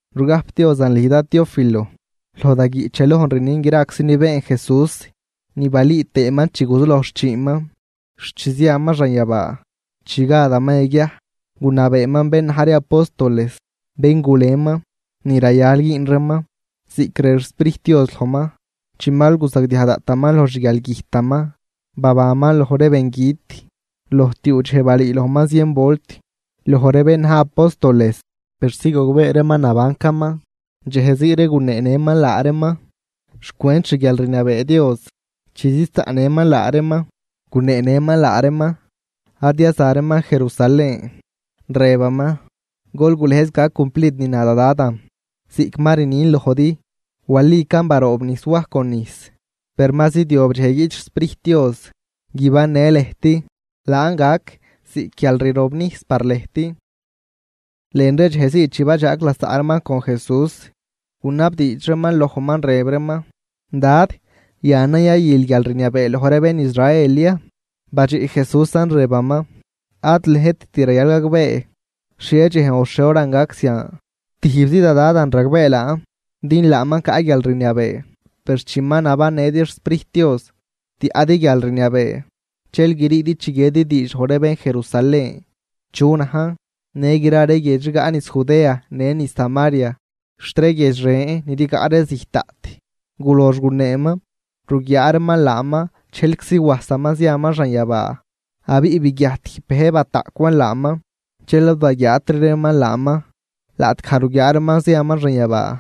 Rugajpdiozan lüj dad Teófilo: Loj da guiꞌch yalojn rnin graczi ni been Jesús ni balüü tëëman chi guzuloj xchiinman xt chi ziaman xanyabaa. Chi gadaman yaguiaj, gunabeeman bén na̱j ree apóstoles, bén guleman, ni rayal güün reeman, ziꞌc rëb xSprijt Dios lojman. Chi mal guzagdiaj daꞌtaman loj xguialgüjtaman, babanman loj ree bengüt. Loj tiuu dxej balüülojman zien volt loj bén na̱j ree apóstoles, persi gogbee reeman nabancaman. Dxej zii ree guneenëman laa reeman xcwent xguialrniabee Dios. Chi ziz zaꞌnëman laa reeman, guneenëman laa reeman ad yaza reeman Jerusalén, rëbaman: ―Gol gulëjz gac cumplid ni na da Dadan ziꞌc ma rnin lojdi. Walican baroobnijs Waj con nijs, per ma zidyob dxej guiꞌt xSprijt Dios guibannë lëjt, laan gac ziꞌc guialrirobnijs par lëjt. Lën ree dxej zii chi badxaag lasaꞌ reeman con Jesús, gunabdiidx reeman lojman rëb reeman: ―Dad, ¿yanan yayül guialrniabee loj ree bén Israel ya? Badxiꞌ Jesúsan rëbaman: ―Ad lëjtit rayal gagbee xhie dxejn o xhie horan gac zian. Tijbzi da Dadan ragbee laan din laaman caꞌ guialrniabee. Per chi ma nabannëdi xSprijt Dios, tiaꞌdi guialrniabee. Dxel griidi chiguiedi diidx loj ree bén Jerusalén chu najn, në gra ree guiedx rigaꞌ niz Judea në niz Samaria, xt ree guiedx ren ni rigaꞌ ree zijt daꞌt. Gulox guneeman, ruguiaa reeman laaman dxejlczi wajsaman ziaman xanyabaa, abiꞌ biguiajt tijb bëj bataꞌcwan laaman, dxel ad baguiaatri reeman laaman. Laꞌtgaj ruguiaa reeman ziaman xanyabaa,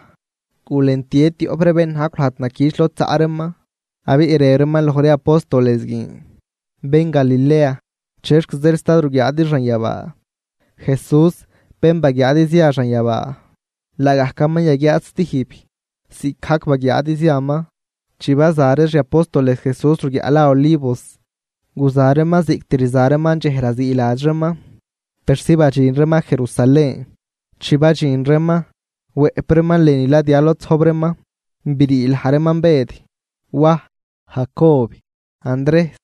gulentie tioꞌp ree bén najcw lajd naquich lod zaꞌ reeman, abiꞌ rëb reeman loj ree apóstoles guin: ―Bén Galilea, ¿chexc zeel sta ruguiaadi xanyabaa? Jesús, bén baguiaadi zia xanyabaa, laagajcaman yaguiaad stijb, ziꞌcgajc baguiaadi ziaman. Chi baza ree xi apóstoles Jesús ruguiaꞌ la Olivos, guza reeman ziꞌct rza reeman dxej raziiladx reeman, persi badxin reeman Jerusalén. Chi badxin reeman, wëꞌp reeman lënü ladya lod zojb reeman. Brii laj reeman Bëd, Waj, Jacob, Andrejs,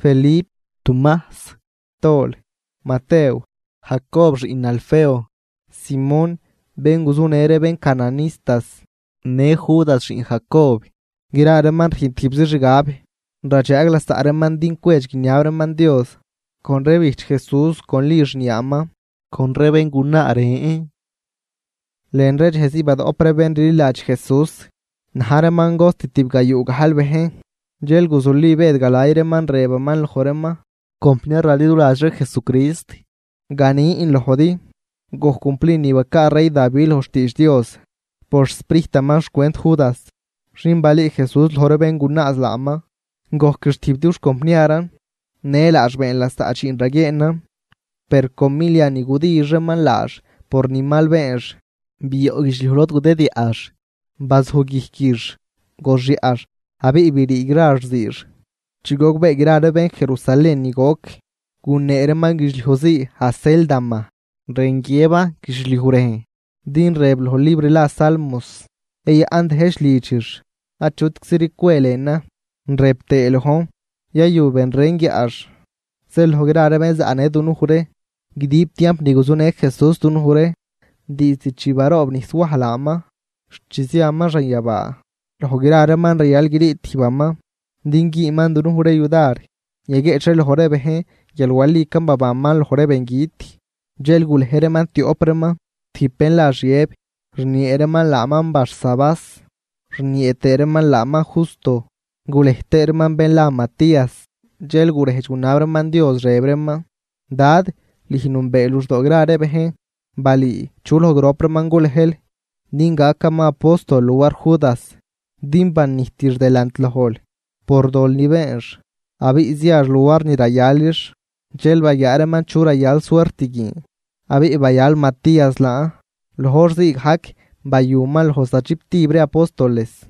Felip, Tumajs, Tol, Matew, Jacob xiꞌn Alfeo, Simón (bén guzunë ree bén cananistas), në Judas xiꞌn Jacob. Gra reeman rüjn tijbzi xgab, radxaag lasaꞌ reeman din cwedx guiniab reeman Dios, con ree bijch Jesús con Li xniaaman, con ree béngunaa ren. Lën ree dxej zii badoꞌp ree bén rliladx Jesús, na̱j reeman cost tibgayuu gajl bejn, dxel guzuli Bëd galay reeman, rëbaman loj reeman: ―Compniar raliduladx ree Jesucrist, ganin lojdi, gojc cumplid ni bacaa rey Davi loj xtiidx Dios por xSprijtaman xcwent Judas, xin balüü Jesús loj ree bén gunaaz laaman, gojquix tijb dux compniaran, në laax been lasaꞌ dxiin raguieenan. Per con milia ni gudix reeman laax por ni mal beenx, bioꞌ guidxliuj lod gudidyaꞌx, bazuj guijquix, goxyaꞌx abiꞌ brii gra xziix. Chi gogbee gra ree bén Jerusalén ni goc, gunee reeman guidxliuj zii Acéldama, rën guiëban guidxliuj rejn. Din rëb loj libr la Salmos: Yayaꞌn dëjch lidxix, achutcziri cwe lënan. Rëb tëë lojn: Yayu ben ren guiaꞌx. ’Zeel loj gra ree bén zaꞌnë dunuj ree guidib tiamp ni guzunë Jesús dunuj ree, diizd chi baroobnijs Waj laaman xt chi ziaman xanyabaa. Loj gra reeman rayal grii tijbaman din güünman dunuj ree yudar yaguieꞌch ree loj ree bejn guial walican babanman loj ree bengüt. Dxel gulej reeman tioꞌp reeman: tijb bén la Xiëb (rniee reeman laaman Barsabás, rniee tëë reeman laaman Justo), gulej tëë reeman bén la Matías. Dxel gurejdx gunab reeman Dios, rëb reeman: ―Dad, lüj nünbee luxdoo gra ree bejn. Balüü chu loj grop reeman gulejl din gacaman apóstol luar Judas, din banijtix delant lojl por dol ni beenx abiꞌ ziax luar ni rayalix. Dxel baguiaa reeman chu yayal suert guin, abiꞌ bayal Matías laan. Loj hor zii gajc bayuman loj zachibtib ree apóstoles.